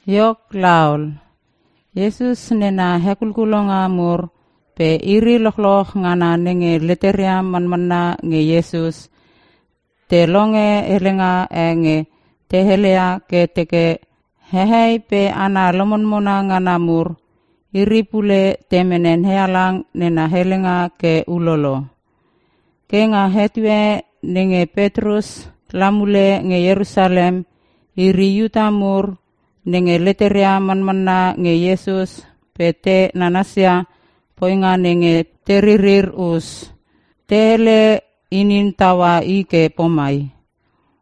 Iok laol, Iesus nena hekulkulonga mur pe iri lochloch ngana nenge leteria manmanna nge Iesus, te longe helenga e nge te heleia ke te teke, hehei pe hana lomonmona ngana mur, iri pule te mene NeHalang nena helenga ke ulolo. Ke nga etue nenge Petrus la mule nge Ierusalem, iri (Iuta mur) nenge leteria manmanna nge Iesus pe te nanasia poinga nenge teririr us, te hele inin taua i ke pomai,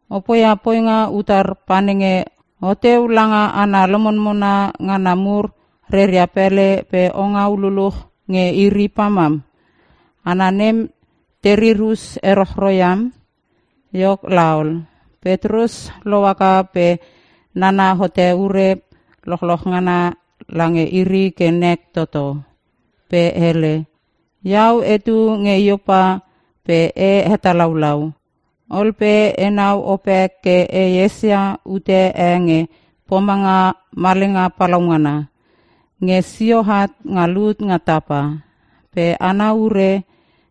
“O poia poinga utar panenge oteu langa hana lomonmona ngana mur reria pele pe ongau luluch nge iri pamam? Hana nem terir us erochro iam!” Iok laol, Petrus lohaka pe nana hote ure lochloch ngana lange iri ke nek toto. Pe hele, “Iau etu nge Iopa pe e hetalaulau. Ol pe enau opek ke e esia ute e nge pomanga malenga palaungana, nge sio at nga lut nga tapa. Pe ana ure,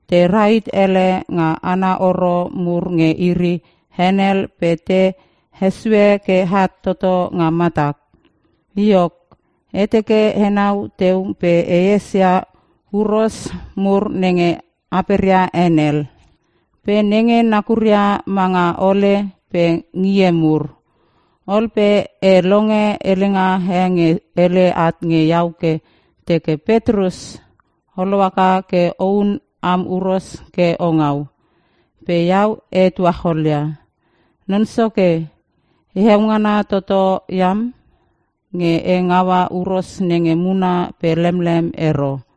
te rahit ele nga ana horo mur nge iri henel pe te hesue ke at toto nga matak. Iok, e teke enau teu pe e esia huros mur nenge aperia henel pe nenge nakuria manga hole, pe ngie mur. Ol pe e longe helenga e nge hele at nge iau ke teke, ‘Petrus, o lohaka ke ohun am huros ke o ngau!’ “Pe iau e tuacholia, ‘Non Soke, heo ngana toto iam, nge e ngaua huros nenge muna pe lemlem ero.’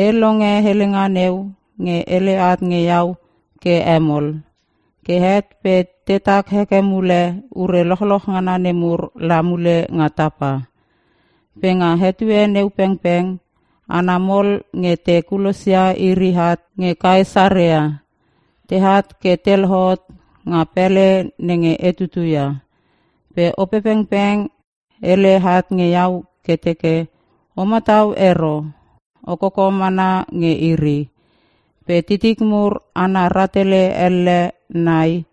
E longe helenga neu nge hele at nge iau ke hemol. Ke het pe tetak heke mule ure lochloch ngana nemur la mule nga tapa. “Pe nga etue neu pengpeng hana mol nge te kulosia iri at nge Kaesarea, teat ke te lohot nga pele nenge e tutuia. Pe Opepengpeng hele at nge iau ke teke, ‘O matau ero. O koko mana nge iri. Pe titik mur hana rahtele elle nei,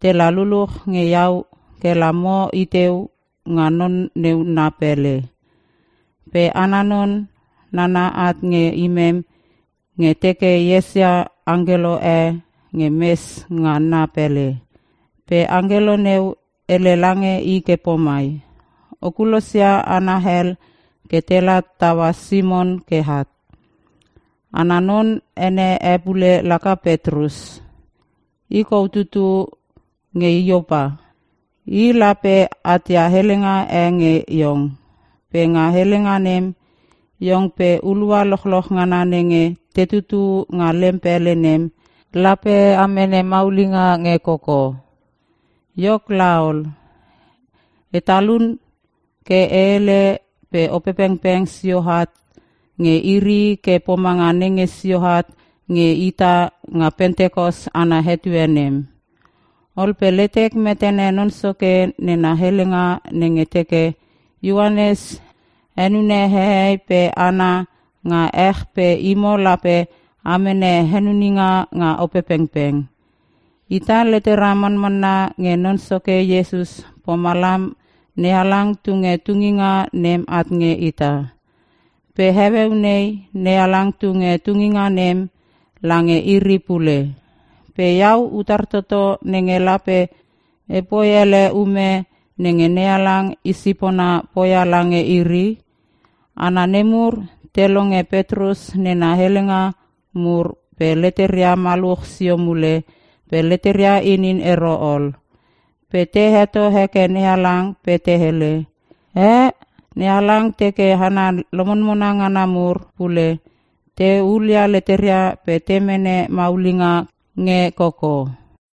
tela luluch nge iau kela mo iteu nga non neu na pele.’ “Pe ana non, nana at nge imem nge teke esia angkelo e nge mes nga na pele. Pe angkelo neu, hele lange i ke pomai, ‘O kulosia hana hel ke tela taua Simon ke at. Ana non ene e pule laka Petrus. I kou tutu nge Iopa. I lape atia helenga e nge iong. Pe nga helenga nem, iong pe hulua lochloch ngana nenge tetu nga lem pele nem, lape a mene maulinga nge koko.’ “Iok laol, e talun ke e helele pe Opepengpeng sioat nge iri ke pomanga nenge sio at nge ita nga Pentikos ana etue nem. Ol pe letek metene Non Soke nena helenga nenge teke, ‘Ioanes henune hehei pe hana nga ech pe imo lape a mene henuninga nga Opepengpeng.’ Ita, letera manmanna nge Non Soke Iesus pomalam NeHalang tunge tunginga nem at nge ita. Pe heueu nei, NeHalang tunge tunginga nem lange iri pule. Pe iau utar toto nenge lape epoi ele ume nenge NeHalang i sipona poia lange iri?” Hana nemur te longe Petrus nena helenga mur pe leteria maluch sio mule pe leteria inin ero ol. Pe te heto heke NeHalang pe te hele, “Eh! NeHalang teke hana lomonmona ngana mur pule, te hulia leteria pe te mene maulinga nge koko.”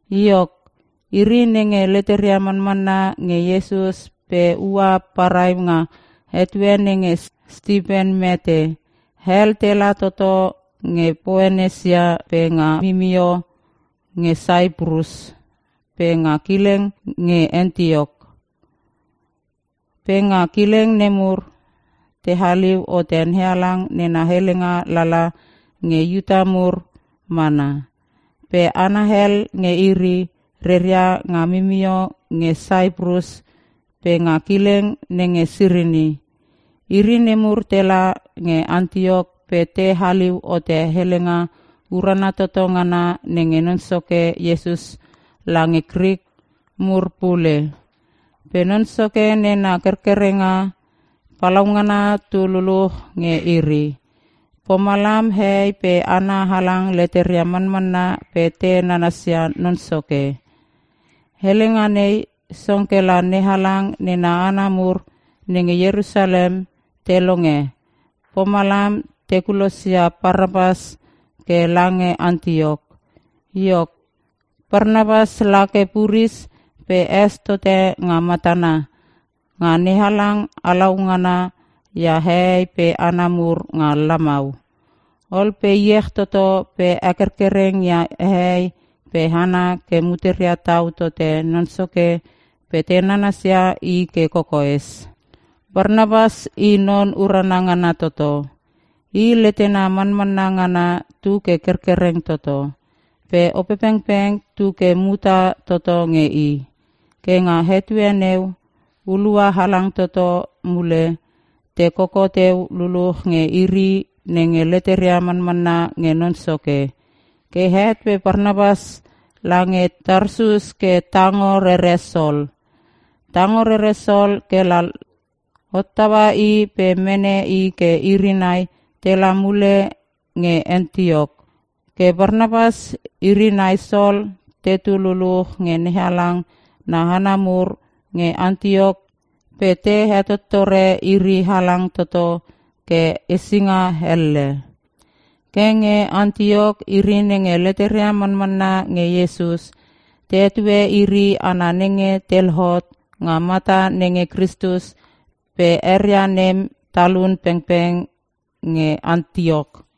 Iok, iri nenge leteria manmanna nge Iesus pe ua parai nga etue nenge Stipen mete, hel tela toto nge Poenesia pe nga mimio nge Saiprus pe nga kileng nge Antiok. Pe nga kileng nemur, te haliu hote NeHalang nena helenga lala nge Iuta mur mana. Pe hana hel nge iri, reria nga mimio nge Saiprus pe nga kileng nenge Sirini. Iri nemur tela nge Antiok pe te haliu hote helenga urana toto ngana nge Non Soke Iesus lange Krik mur pule. Pe Non Soke nena kerkerenga palaungana tu luluch nge iri, pomalam hehei pe hana halang leteria manmanna pe te nanasia Non Soke. Helenga nei, song kela NeHalang nena hana mur nenge Ierusalem te longe, pomalam te kulosia Parnapas ke lange Antiok. Iok, Parnapas lake puris, pe es tote nga matana nga NeHalang halaungana ia hehei pe hana mur nga lamau. Ol pe iech toto pe hekerkereng ia hehei pe hana ke muteria tau tote Non Soke pe te nanasia i ke kokoes. Parnapas i non urana ngana toto. I, letena manmanna ngana tu ke kerkereng toto, pe Opepengpeng tuke muta toto nge i. Ke nga etue neu, hulua halang toto mule, te koko teu luluch nge iri nenge leteria manmanna nge Non Soke. Ke het pe Parnapas lange Tarsus ke tango rere Sol. Tango rere Sol kela hottaua i pe mene i ke iri nai tela mule nge Antiok. Ke Parnapas iri nai Sol tetu luluch nge NeHalang na hana mur nge Antiok pe te hetottore iri halang toto ke hesinga elle. Ke nge Antiok, iri nenge leteria manmanna nge Iesus, te hetue iri hana nenge te lohot nga mata nenge Kristus pe eria nem talun pengpeng nge Antioch.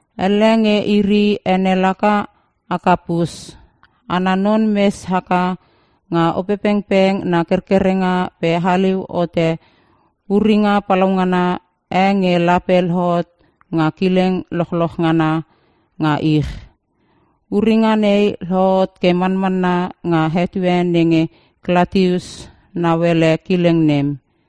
Elle nge iri ene laka Akapus. Ana non mes haka nga Opepengpeng na kerkerenga pe haliu hote uringa palaungana e nge lape lohot nga kileng lochloch ngana nga ich. (Uringa nei lohot ke manmanna nga etue nenge Klatius nauele kileng nem.)